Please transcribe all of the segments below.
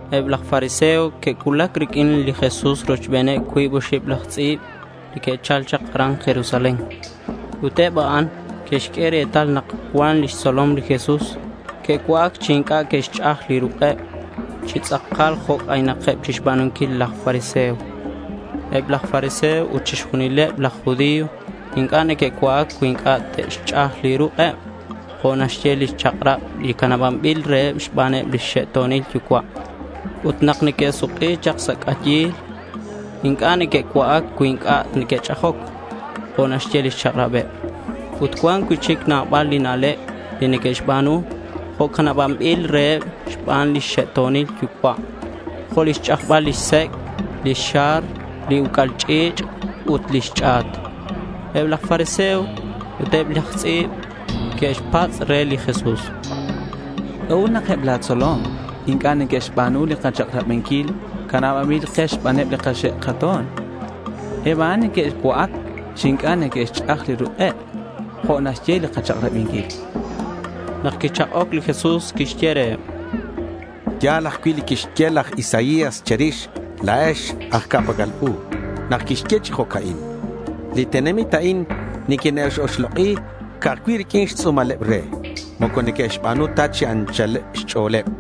Eb laj fariseo que'cuulac riq'uin li Jesús rochbeneb cuib oxib laj tz'i̱b li que'chal chak aran Jerusalén. Ut eb a'an que'xq'ue retal nak cuan lix tzolom li Jesús que'cua'ac chi inc'a' que'xch'aj li ruk'eb chi tz'akal jo' c'aynakeb chixba̱nunquil laj fariseo. Eb laj fariseo ut chixjunileb laj judío inc'a' neque'cua'ac cui inc'a' te'xch'aj li ruk'eb jo' naxye li chak'rab li canabanbil reheb xbaneb lix xe'to̱nil yucua'. Ut nak neque'suk'i chak sa' c'ayil inc'a' neque'cua'ac cui inc'a' neque'ch'ajoc jo' naxye lix chak'rabeb. Ut cuan cui'chic nabal li na'leb li neque'xba̱nu jo' canabanbil reheb xbaneb li xe'to̱nil yucua', jo' li xch'ajbal lix sec', lix xar, li uc'al ch'i̱ch' ut lix ch'a̱t. Eb laj fariseo ut eb laj tz'i̱b que'xpatz' re li Jesús: —¿C'a'ut nak eb la̱ tzolom inc'a' neque'xba̱nu li kachak'rabinquil canabanbil ke xbaneb li kaxe' kato̱n? Eb a'an neque'cua'ac chi inc'a' neque'xch'aj li ruk'eb jo' naxye li kachak'rabinquil, chanqueb. Nak quichak'oc li Jesús quixye reheb: —Ya̱l ajcui' li quixye laj Isaías che̱rix la̱ex aj ca'pac'al u nak quixye chi jo'ca'in: Li tenamit a'in niquine'x-oxlok'i ca'aj cui' riq'uin xtz'u̱maleb re. Moco neque'xba̱nu ta chi anchal xch'o̱leb.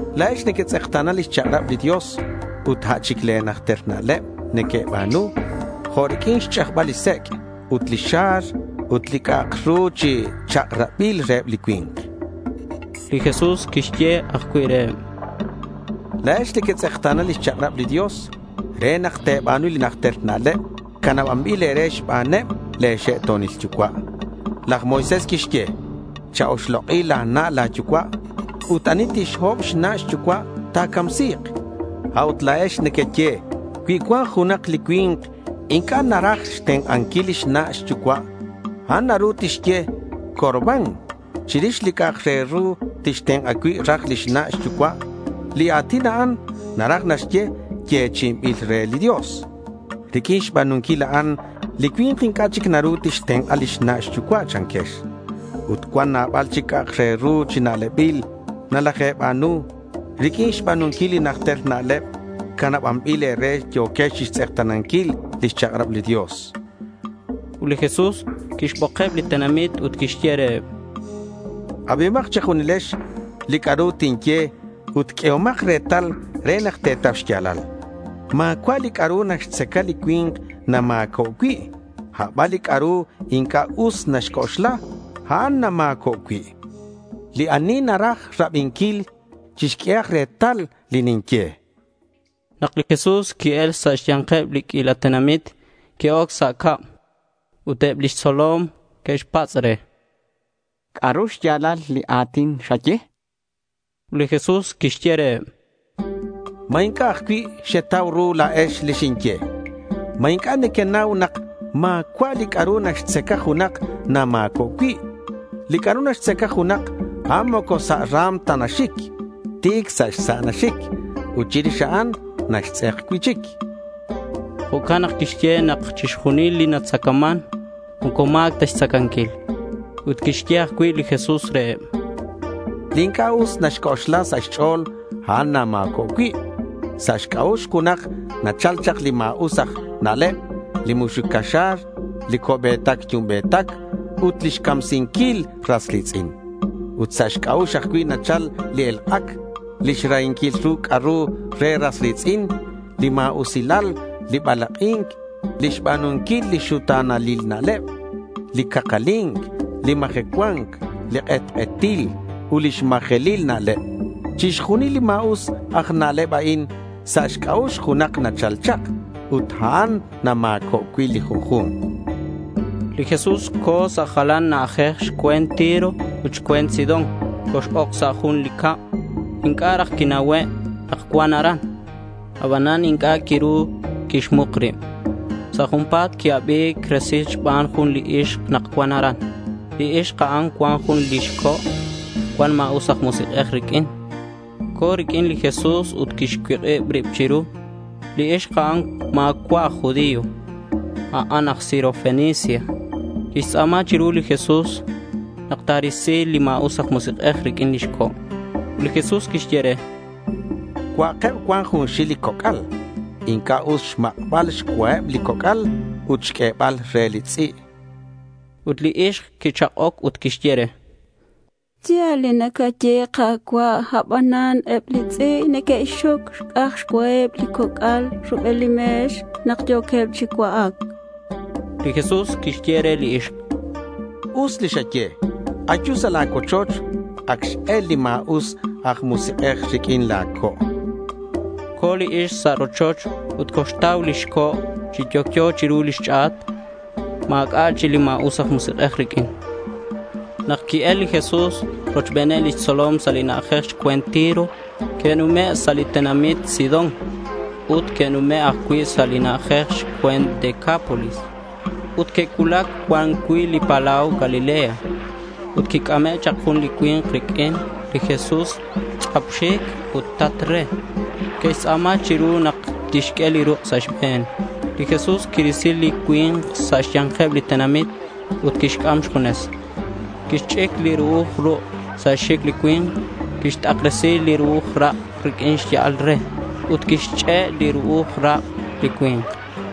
La̱ex nequetz'ekta̱na lix chak'rab li Dios, ut a' chic le̱ najter na'leb nequeba̱nu, jo' riq'uin xch'ajbal li sec' ut li xar ut li c'a'ak ru chi chak'rabil reheb li cui̱nk.— Li Jesús quixye ajcui' reheb: —La̱ex nequetz'ekta̱na lix chak'rab li Dios re nak te̱ba̱nu li najter na'leb canabanbil e̱re xbaneb le̱ xe'to̱nil yucua'. Laj Moisés quixye, “Cha-oxlok'i la̱ na' la̱ yucua' ut ani tixhob xna' xyucua', ta̱camsi̱k.” A'ut la̱ex nequeye cui cuan junak li cui̱nk inc'a' naraj xtenk'anquil lix na' xyucua', a'an naru tixye, “Corbán”, chirix li c'a'ak re ru tixtenk'a cui' raj lix na' xyucua'. Li a̱tin a'an naraj naxye “yechi'inbil re li Dios”. Riq'uin xba̱nunquil a'an li cui̱nk inc'a' chic naru tixtenk'a lix na' xyucua', chanquex. Ut cuan nabal chic c'a'ak re ru chi na'lebil nalaje̱ba̱nu. Riq'uin xba̱nunquil li najter na'leb canabanbil e̱re, yo̱quex chixtz'ekta̱nanquil lix chak'rab li Dios, chan li Jesús reheb. Ut li Jesús quixbokeb li tenamit ut quixye reheb: —Abihomak che̱junilex li c'a'ru tinye ut q'uehomak retal re nak te̱tau xya̱lal. Ma̱cua' li c'a'ru naxtzaca li cui̱nk nama̱co' cui'; aban li c'a'ru inc'a' us naxc'oxla, a'an nama̱co' cui'. Li ani naraj rabinquil, chixq'uehak retal li ninye.— Nak li Jesús qui-el sa' xya̱nkeb li q'uila tenamit, qui-oc sa' cab. Ut eb lix tzolom que'xpatz' re: —¿C'a'ru xya̱lal li a̱tin xaye?— Ut li Jesús quixye reheb: —¿Ma inc'a' ajcui' xetau ru la̱ex li xinye? ¿Ma inc'a' nequenau nak ma̱cua' li c'a'ru naxtzaca junak nama̱co' cui'? Li c'a'ru naxtzaca junak, a'an moco sa' ra̱m ta naxic. Ti̱c sa' xsa' naxic ut chirix a'an naxtz'ek cui'chic, chan. Jo'can nak quixye nak chixjunil li natzacaman moco ma̱c ta xtzacanquil. Ut quixye ajcui' li Jesús reheb: —Li inc'a' us naxc'oxla sa' xch'o̱l, a'an nama̱cob cui'. Sa' xc'a'ux junak nachal chak li ma̱us aj na'leb, li muxuc caxa̱r, li co'be̱tac yumbe̱tac, ut li xcamsinquil ras ri̱tz'in. Ut sa' xc'a'ux ajcui' nachal li elk'ac, lix rahinquil ru c'a'ru re ras ri̱tz'in, li ma̱usilal, li balak'i̱nc, li xba̱nunquil li xuta̱nalil na'leb, li cakali̱nc, li majecua̱nc, li k'etk'etil, ut lix majelil na'leb. Chixjunil li ma̱us aj na'leb a'in sa' xc'a'ux junak nachal chak ut a'an nama̱cob cui' li junju̱nk.— Li Jesús co̱ sa' jalan na'ajej xcue̱nt Tiro ut xcue̱nt Sidón. Cox-oc sa' jun li cab. Inc'a' raj quiraj quinauhe' nak cuan aran. Abanan inc'a' quiru quixmuk rib. Sa' junpa̱t qui-abi̱c resil xban jun li ixk nak cuan aran. Li ixk a'an cuan jun lix co' cuan ma̱us aj musik'ej riq'uin. Co̱ riq'uin li Jesús ut quixcuik'ib rib chiru. Li ixk a'an ma̱cua' aj judío, a'an aj Sirofenicia. Quixtz'a̱ma chiru li Jesús nak ta̱risi li ma̱us aj musik'ej riq'uin lix co'. Ut li Jesús quixye re: —Cua'akeb cuan junxil li coc'al. Inc'a' us xmak'bal xcuaheb li coc'al ut xq'uebal reheb li tz'i', chan. Ut li ixk quichak'oc ut quixye re: —Ya̱l li nacaye, Ka̱cua', abanan eb li tz'i' neque'xxoc xc'aj xcua li coc'al rubel li me̱x nak yo̱queb chi cua'ac, chan. Li Jesús quixye re li ixk: —Us li xaye. Ayu sa' la̱ cuochoch. Ac x-el li ma̱us aj musik'ej riq'uin la̱ co', chan. Co̱ li ixk sa' li rochoch ut coxtau lix co' chi yocyo chiru lix ch'a̱t. Ma̱c'a' chic li ma̱us aj musik'ej riq'uin. Nak qui-el li Jesús rochbeneb lix tzolom sa' li na'ajej xcue̱nt Tiro, que'nume' sa' li tenamit Sidón. Ut que'nume' ajcui' sa' li na'ajej xcue̱nt Decápolis, ut que'cuulac cuan cui' li palau Galilea. Ut quic'ame' chak jun li cui̱nk riq'uin li Jesús tz'ap xic ut tat re. Que'xtz'a̱ma chiru nak tixq'ue li ruk' sa' xbe̱n. Li Jesús quirisi li cui̱nk sa' xya̱nkeb li tenamit ut quixc'am xjunes. Quixch'ic li ru'uj ruk' sa' xxic li cui̱nk. Quixt'akresi li ru'uj ruk' riq'uin li xya'al re ut quixch'e' li ru'uj rak' li cui̱nk.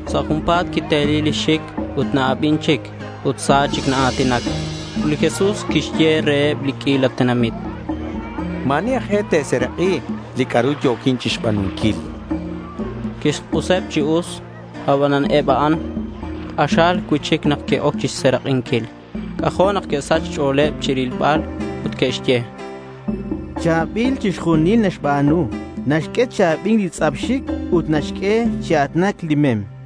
Sa' junpa̱t quiteli lix xic ut na-abin chic ut sa chic naa̱tinac. Ut li Jesús quixye reheb li q'uila tenamit: —Ma̱ ani aj e te̱serak'i li c'a'ru yo̱quin chixba̱nunquil, chan. Quixk'useb chi us. Abanan eb a'an k'axal cui'chic nak que'oc chixserak'inquil. C'ajo' nak que'sach xch'o̱leb chirilbal ut que'xye: —Cha̱bil chixjunil li naxba̱nu. Naxq'ue chi abi̱nc li tz'ap xic ut naxq'ue chi a̱tinac li mem, chanqueb.